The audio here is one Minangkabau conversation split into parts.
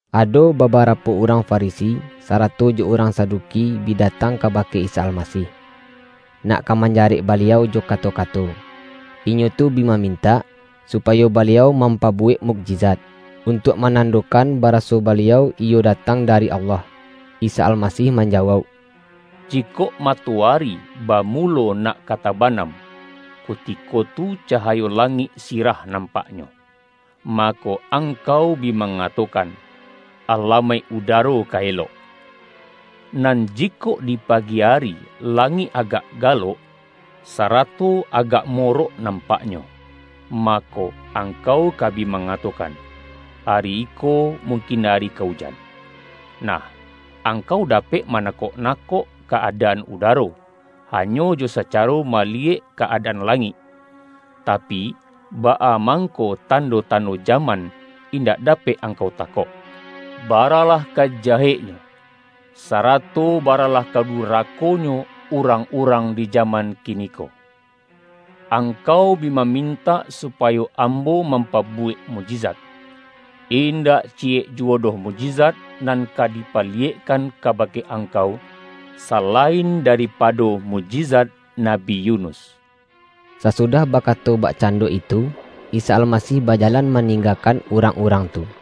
Ado babarapo urang Farisi, sa-rato jo urang Saduki bi datang kabake Isa Almasih, nak ka manja-rek Baliau jo kato-kato. Inyo tu bi ma-mintak, supayo Baliau mampabuwek mukjizat, untuak manandokan bara-so Baliau iyo datang dari Allah. Isa Almasih manjawauk, [”Jikok mato-ari bamulo nak ka tabanam, kutiko tu cahayo langik sirah nampaknyo, ma-ko, angkau bi mangatokan, ’Alamaik udaro ka elok.’ Nan jikok di pagi ari langik agak galok, sarato agak mo-rok nampaknyo, mako, angkau ka bi mangatokan, ’Ari iko mungkin ari ka ujan.’ Nah, angkau dapek manakok-nakok ka-adaan udaro, hanyo jo sa-caro maliyek ka-adaan langik, tapi, baa mangko tando-tando jaman, in-dak dapek angkau takok!”] ”Baralah ka jaheknyo, sarato baralah ka dura-konyo urang-urang di jaman kiniko. Angkau bi mamintak supayo Ambo mampabuwek mukjizat. Indak ciyek juwo doh mukjizat nan ka dipaliyekkan kabake angkau, salain daripado mukjizat Nabi Yunus.” Sasudah bakato bakcando itu, Isa Almasih bajalan maninggakan urang-urang tu.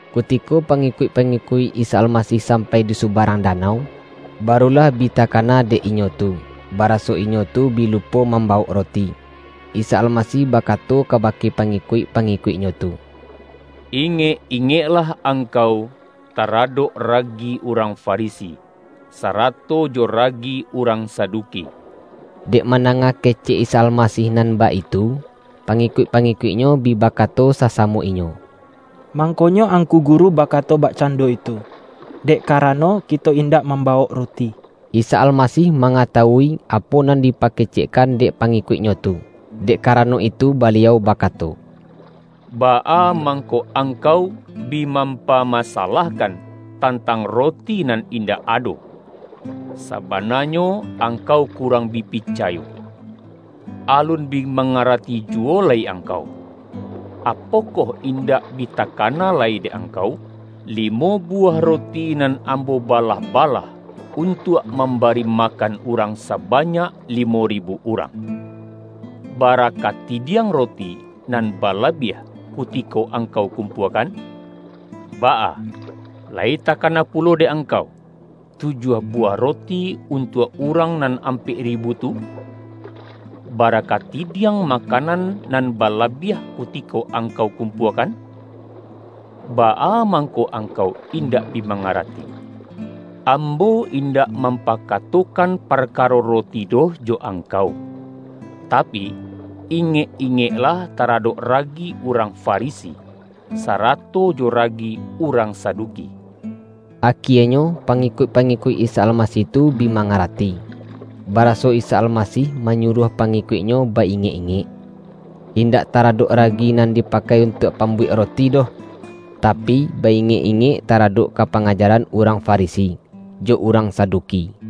Kutiko pangikuik-pangikuik Isa Almasih sampai di subarang danau, barulah bi takana dek inyo tu, baraso inyo tu bi lupo mambawok roti. Isa Almasih bakato kabake pangikuik-pa-ngikuik-Nyo tu,”Ingek-ingeklah ang-kau taradok ragi urang Farisi, sarato jo ragi urang Saduki.” Dek mandanga kecek Isa Almasih nan baitu, pangikuik-pangikuik-Nyo bi bakato sasamo inyo,”Mangkonyo Angku Guru bakato bakcando itu, dek karano kito indak mambawok roti.” Isa Almasih mangatawui apo nan dipakecekkan dek pangikuik-Nyo tu. Dek karano itu Baliau bakato,”Baa mangko angkau bi mampamasalahkan tantang roti nan indak ado? Sabana-nyo angkau kurang bi picayo! Alun bi mangarati juwo lai angkau? Apo-koh indak bi takana lai dek angkau, limo buwah roti nan Ambo balah-ba-lah, untuak mambari makan urang sabanyak limo ribu urang? Bara kati-diang roti nan balabiah kutiko angkau kumpuakan? Baa, lai takana pulo dek angkau, tujuah buwah roti untuak urang nan ampek ribu tu? Bara kati-diang makanan nan balabiah kutiko angkau kumpuakan? Baa mangko angkau indak bi mangarati, Ambo in-dak mampakatokan parkaro roti doh jo angkau? Tapi, ingek-ingeklah tara-dok ragi urang Farisi, sarato jo ragi urang Saduki!” Akienyo pangikuik-pangikuik Isa Almasih tu bi mangarati, baraso Isa Almasih manyuruah pangikuik-Nyo ba-ingek-ingek, indak taradok ragi nan di-pakai untuak pambuwek roti doh, tapi, ba-ingek-ingek taradok ka pangajaran urang Farisi, jo urang Saduki.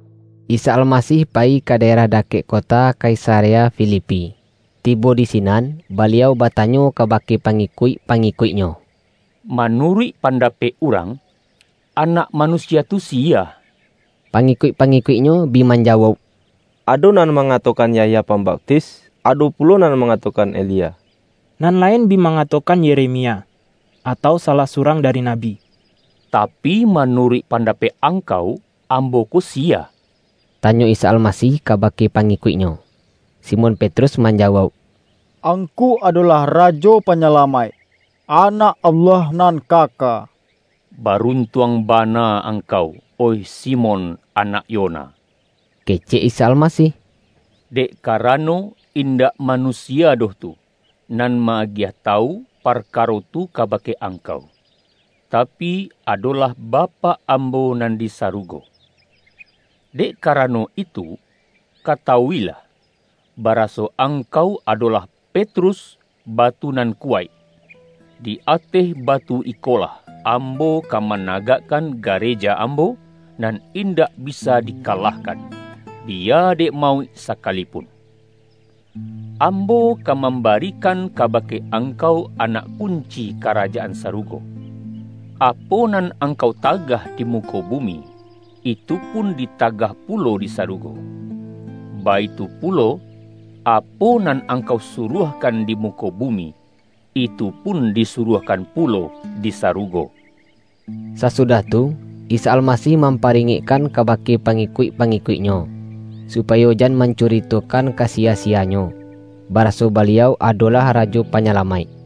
Isa Almasih payi ka daerah da-kek kota Kaisarea Filipi. Tibo di sinan, Baliau batanyo kabake pangikuik-pa-ngikuik-Nyo,”Manuruik pandapek urang, Anak Manusia tu siya?” Pangikuik-pangikuik-Nyo bi man-jawauk,”Ado nan mangatokan Yahya Pambaptis. Ado pulo nan mangatokan Elia. Nan lain bi mangatokan Yeremia, atau salah surang dari nabi.” ”Tapi, manuruik pandapek ang-kau, Ambo ko siya?” tanyo Isa Almasih kabake pangikuik-Nyo. Simon Petrus manjawauk,”Ang-ku adolah Rajo Panyalamaik, Anak Allah Nan Kaka.” ”Baruntuang bana angkau, oih Si-mon anak Yona!” kecek Isa Almasih.”Dek karano, indak manusia doh tu, nan ma-agiah tawu parkaro tu kabake ang-kau, tapi, adolah Bapak Ambo nan di sa-rugo. Dek karano itu, katawuilah, ba-raso angkau adolah Petrus, batu nan kuwaik. Di ateh batu ikolah Ambo ka managakkan gareja Ambo, nan indak bisa dikalahkan; biya dek mauik saka-lipun! Ambo ka mambarikan kabake angkau anak kunci Karajaan Sarugo. Apo nan angkau tagah di muko bumi, itupun ditagah pulo di sarugo. Baitu pulo, apo nan angkau suruahkan di muko bumi, itupun disuruahkan pulo di sarugo.” Sasudah tu, Isa Almasih mampa-ringekkan kabake pangikuik-pangi-kuik-Nyo, supayo jan mancuritokan ka siya-siyanyo, baraso Baliau ado-lah Rajo Panyalamaik.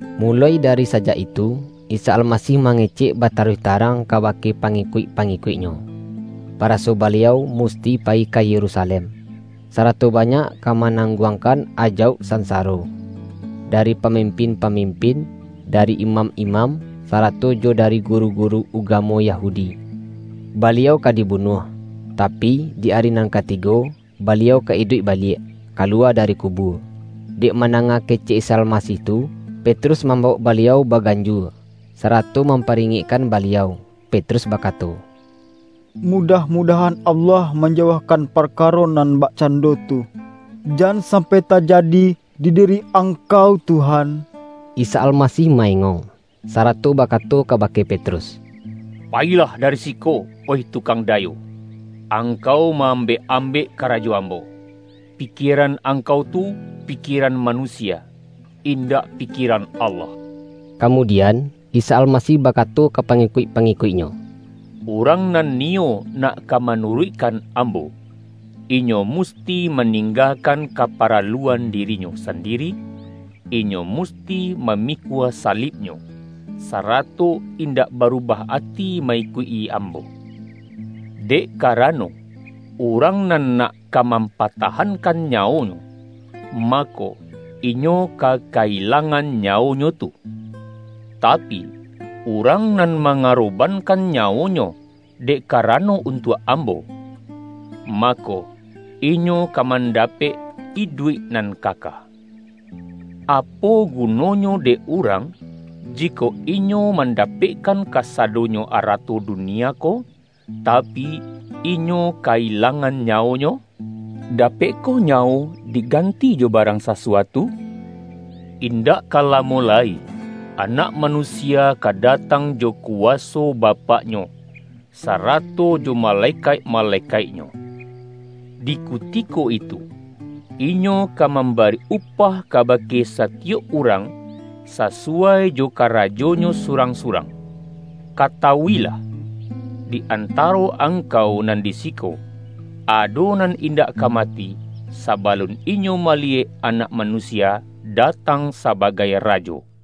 Muloi dari sajak itu, Isa Almasih mangecek bataruih tarang kabake pa-ngikuik-pangikuik-Nyo, baraso Baliau musti payi ka Yerusalem, sarato ba-nyak ka manangguangkan ajauk san-saro, dari pamimpin-pamimpin, dari imam-imam, sarato jo dari guru-gu-ru ugamo Yahudi. Baliau ka dibunuah, tapi, di ari nan katigo, Baliau ka iduik baliak, kaluwa dari kubua. Dek mandanga kecek Isa Almasih tu, Petrus mambawok Baliau bagan-jua, sarato mamparingekkan Baliau, Petrus bakato,”Mudah-mudahan Allah manjauahkan parkaro nan bakcan-do tu! Jan sampai tajadi di diri Ang-kau Tuhan!” Isa Almasih ma-engong, sarato bakato kabake Petrus,”Payilah dari siko, oih Tukang dayo! Angkau ma-ambek-ambek karajo Ambo. Pikieran angkau tu pikieran manusia; indak pi-kieran Allah!” Kamudian, Isa Almasih bakato ka pangikuik-pangikuik-Nyo,”Urang nan niyo nak ka manuruikkan Ambo, inyo musti maninggakan kaparaluan diri-nyo sandiri, inyo musti mamikua salib-nyo, sarato indak barubah ati ma-ikuik-i Ambo. Dek karano, urang nan nak ka mampatahankan nyawonyo, mako, inyo ka ka-ilangan nyawonyo tu. Tapi, urang nan mangarobankan nyawonyo, dek karano untuak Ambo, mako, inyo ka mandapek iduik nan kaka. Apo gunonyo dek urang, jikok inyo manda-pekkan kasadonyo arato dunia ko, tapi, inyo ka-ilangan nyawonyo? Dapekkoh nyawo diganti jo barang sasuatu? Indak ka lamo lai, Anak Manusia ka datang jo kuwaso Bapak-Nyo, sarato jo malekaik-malekaik-Nyo. Di kuti-ko itu, Inyo ka mambari upah kabake satiyok urang, sasuwai jo karajonyo su-rang-surang. Katawuilah! Di anta-ro angkau nan di siko, ado nan indak ka mati, sabalun inyo maliyek Anak Manusia datang sabagai Ra jo.”